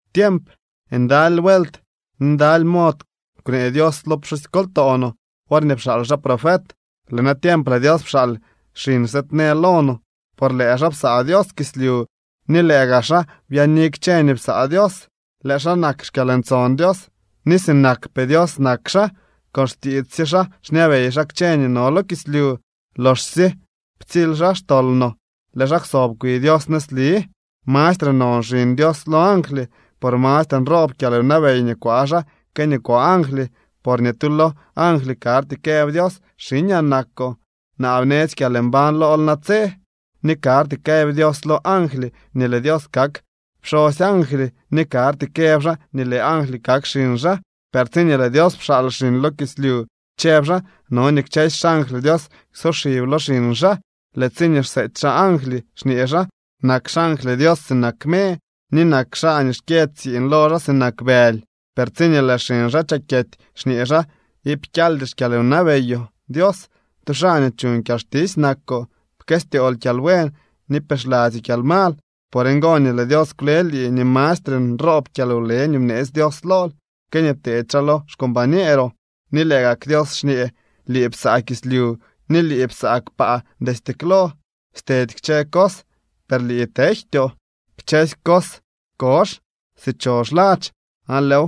Tiemp, ndaly vuelt ni ndaly mod kwnee Dios lo pxusykoltoo no worñee pxaal xaa profet. Lëë natiemp lëë Dios pxaal xiñ sëëdnee lo no. Por lëë xaa psaa Dios kislyu ni lëë gaa xaa byaani kchë nii psaa Dios. Lëë xaa nak xkyalntson Dios ni sinakpee Dios nak xaa. Con xtiits sye xaa xñabey xaa kchë nii no lo kislyu. Loxsye ptsily xaa xtol no lëë xaa kwsob kwi Dios nëzli. Mastre non Xiñ Dios lo angly, por mastre nroob kyalwnabey nii kwaa xaa que nii kwaa angly. Por ni tu lo angly karty këb Dios: Xiñaa nakoo, naa bnetsy kyalmbañ lool natse. Ni karty kaa këb Dios lo angly nii lëë Dios kak pxosy angly, ni karty këb xaa nii lëë angly kak xiñ xaa. Per tsiñee lëë Dios pxaal xiñ lo kislyu, chëb xaa: No nii kchësy xangly Dios ksoxib lo xiñ xaa. Lëë tsiñee xseety xaa angly, xñee xaa: Nak xangly Dios sinak me, ni nak xaa nii xkyë tsiiñ lo xaa sinak bëly. Per tsiñee lëë xiñ xaa chakyety, xñee xaa: Iip kyaldy xkyalwnabeyoo, Dios, tu xaa nii chuñ kyalxtisy nakoo. Pkëstyool kyalbuen ni pixladzyoo kyalmal. Por ngo nii lëë Dios kwle lii ni mastre nroob kyalwle nii bneetsy Dios lool que nii pteedy xaa lo xcombañeeroo. Ni lëë gak Dios xñee: Lii psaa kislyu ni lii psaa kpaa destye klo. Stedy kchë cos, per lii tejtyoo. Kchësy cos kozh si chozh ladx, aan lëëw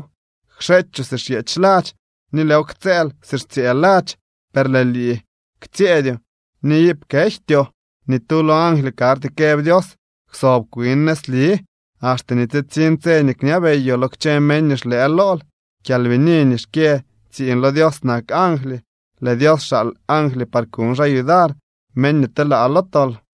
kxeechoo si xyeech ladx, ni lëëw ktsëël si xtsyëë ladx. Per lëë lii ktsyëëdyoo ni iip kejtyoo. Ni tu lo angly karty këb Dios: Kwsob kwin nëzli, axte nii tsitsiñ tse nii kñabeyoo lo kchë meñ nii xlëë lool. Kyalbini nii xkyë tsiiñ lo Dios nak angly. Lëë Dios xaal angly par kuñ xaa yudar meñ nii telaa lo tol.